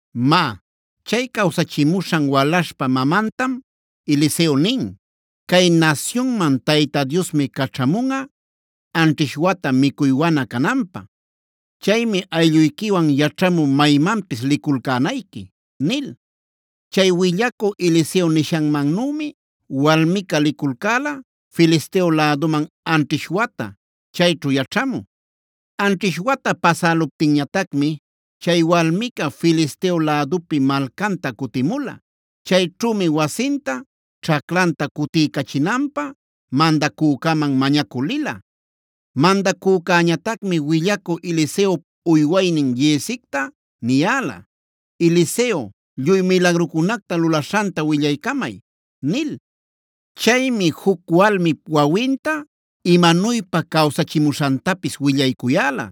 Má, chay cawsachimuśhana walaśhpa mamantam Eliseo nin: “Cay nasyunman Tayta Diosmi caćhamunꞌa anćhish wata micuy wana cananpä. Chaymi aylluyquiwan yaćhamü maymanpis liculcänayqui” nil. Chay willacü Eliseo nishanmannümi walmica liculcäla Filisteo läduman anćhish wata chayćhu yaćhamü. Anćhish wata pasäluptinñatacmi chay walmica Filisteo lädupi malcanta cutimula. Chayćhümi wasinta, ćhaclanta cutiycachinanpä mandacücäman mañacü lila. Mandacücäñatacmi willacü Eliseop uywaynin Giezicta niyäla: “Eliseo lluy milagrucunacta lulaśhanta willaycamay” nil. Chaymi juc walmip wawinta imanuypa cawsachimuśhantapis willaycuyäla.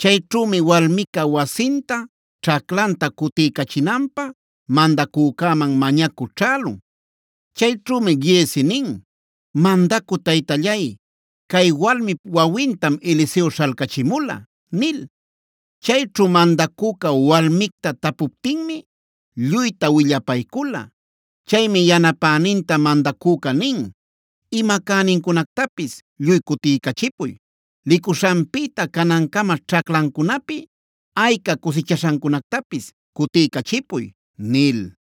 Chayćhümi walmica wasinta, ćhaclanta cutiycachinanpä mandacücäman mañacü ćhälun. Chayćhümi Giezi nin: “Mandacü taytallay, cay walmip wawintam Eliseo śhalcachimula” nil. Chayćhu mandacüca walmicta tapuptinmi lluyta willapaycula. Chaymi yanapäninta mandacüca nin. “Ima cänincunactapis lluy cutiycachipuy. Licuśhanpïta canancama ćhaclancunapi ayca cusichaśhancunactapis cutiycachipuy” nil.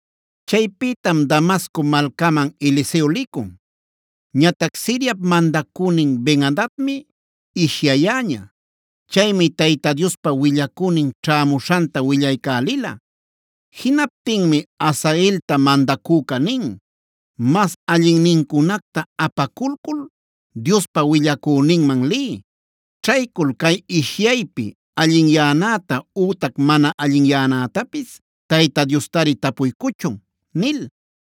Chaypïtam Damasco malcaman Eliseo licun. Ñatac Siriap mandacünin Ben-adadmi ishyayäña. Chaymi Tayta Diospa willacünin ćhämuśhanta willaycälila. Jinaptinmi Hazaelta mandacüca nin: “Mas allinnincunacta apaculcul Diospa willacüninman liy. Ćhaycul cay ishyaypi allinyanäta ütac mana allinyanätapis Tayta Diostari tapuycuchun” nil.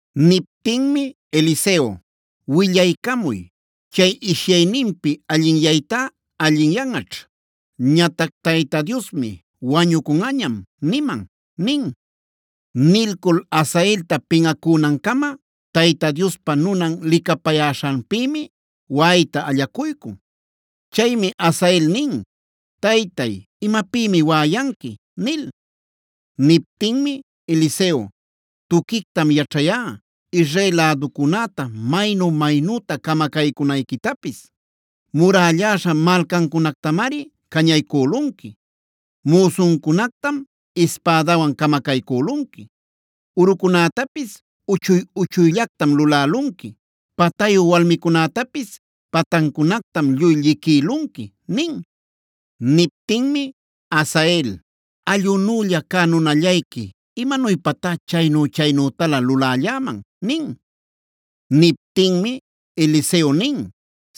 Niptinmi Eliseo: “Willaycamuy, chay ishyayninpi allinyaytá allinyanꞌaćh. Ñatac Tayta Diosmi: ‘Wañucunꞌañam’ niman” nin. Nilcul Hazaelta pinꞌacünancama Tayta Diospa nunan licapäcuyäśhanpïmi waꞌayta allacuycun. Chaymi Hazael nin: “Taytay, ¿imapïmi waꞌayanqui?” nil. Niptinmi Eliseo: “Tuquictam yaćhayá Israel läducunäta maynu-maynüta camacaycunayquitapis. Murälläśha malcancunactamari cañaycülunqui, müsuncunactam ispädawan camacaycülunqui, urucunätapisb uchuy-uchuyllactam lulälunqui, patayu walmicunätapis patancunactam lluy lliquïlunqui” nin. Niptinmi Hazael: “Allꞌunülla cä nunallayqui ¿imanuypatá chaynu-chaynütalä lulälläman?” nin. Niptinmi Eliseo nin: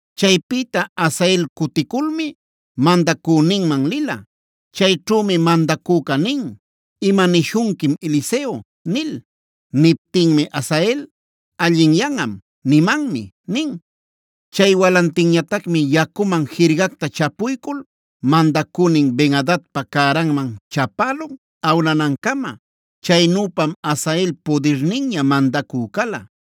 Chaypïta Hazael cuticulmi mandacüninman lila. Chayćhümi mandacüca nin: “¿Imanishunquim Eliseo?” nil. Niptinmi Hazael: “Allinyanꞌam, nimanmi” nin. Chay walantinñatacmi yacuman jirgacta chapuycul mandacünin Ben-adadpa cäranman chapälun awnanancama. Chaynüpam Hazael pudirninña mandacü cala.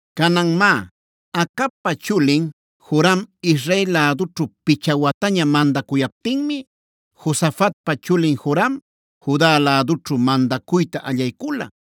Canan má, Acabpa chulin Joram Israel lädućhu picha wataña mandacuyaptinmi Josafatpa chulin Joram Juda lädućhu mandacuyta allaycula.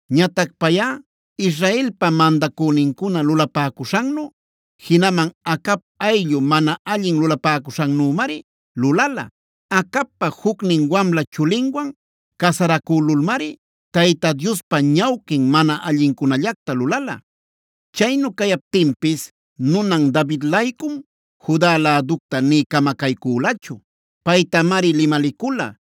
Ñatac payꞌa Israelpa mandacünincuna lulapäcuśhannu, jinaman Acab ayllu mana allin lulapäcuśhannümari lulala. Acabpa jucnin wamla chulinwan casaracülulmari Tayta Diospa ñawquin mana allincunallacta lulala. Chaynu cayaptinpis nunan David-laycum Juda läducta nï camacaycülachu. Paytamari limalicula: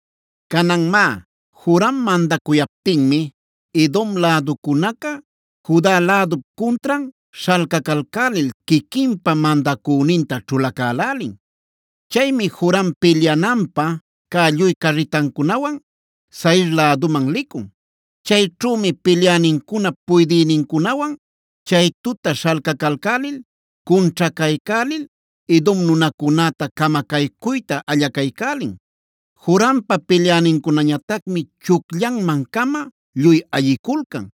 Canan má, Joram mandacuyaptinmi Edom läducunaca Judae lädup cuntran śhalcacalcälil quiquinpa mandacüninta ćhulacälälin. Chaymi Joram pilyananpä cä lluy carritancunawan Zair läduman licun. Chayćhümi pilyänincunap puydïnincunawan chay tuta śhalcacalcälil, cunćhacaycälil Edom nunacunäta camacaycuyta allacaycälin. Jorampa pilyänincunañatacmi chucllanman-cama lluy ayiculcan.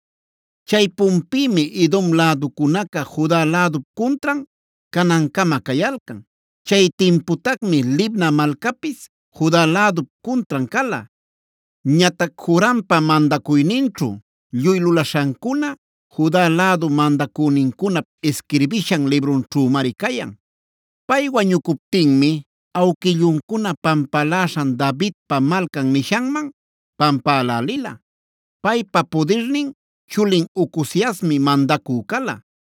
Chaypunpïmi Edom läducunaca Juda lädup cuntran canancama cayalcan. Chay timputacmi Libna malcapis Juda lädup cuntran cala. Ñatac Jorampa mandacuyninćhu lluy lulaśhancuna Juda lädu mandacünincunap isquirbishan librunćhümari cayan. Pay wañucuptinmi awquilluncuna pampaläśhan Davidpa Malcan nishanman pampälälila. Paypa pudirnin chulin Ocoziasmi mandacü cala.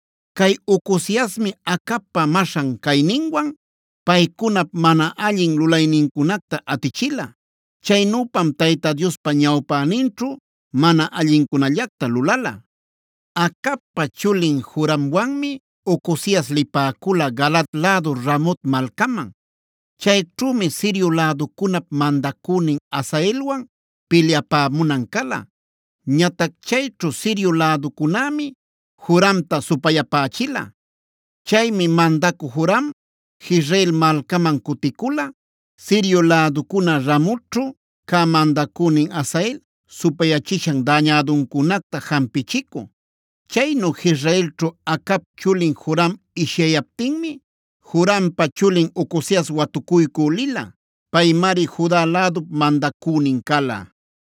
Cay Ocoziasmi Acabpa maśhan cayninwan paycunap mana allin lulaynincunacta atichila. Chaynüpam Tayta Diospa ñawpäninćhu mana allincunallacta lulala. Acabpa chulin Joramwanmi Ocozias lipäcula Galaad lädu Ramot malcaman. Chayćhümi Sirio läducunap mandacünin Hazaelwan pilyapämunan cala. Ñatac chayćhu Sirio läducunämi Joramta supayapächila. Chaymi mandacü Joram, Jezreel malcaman cuticula Sirio läducuna Ramotćhu cä mandacünin Hazael supayapachishan dañäduncunacta jampichicü. Chaynu Jezreelćhu Acabpa chulin Joram ishyayaptinmi Jorampa chulin Ocozias watucuycü lila. Paymari Juda lädup mandacünin cala.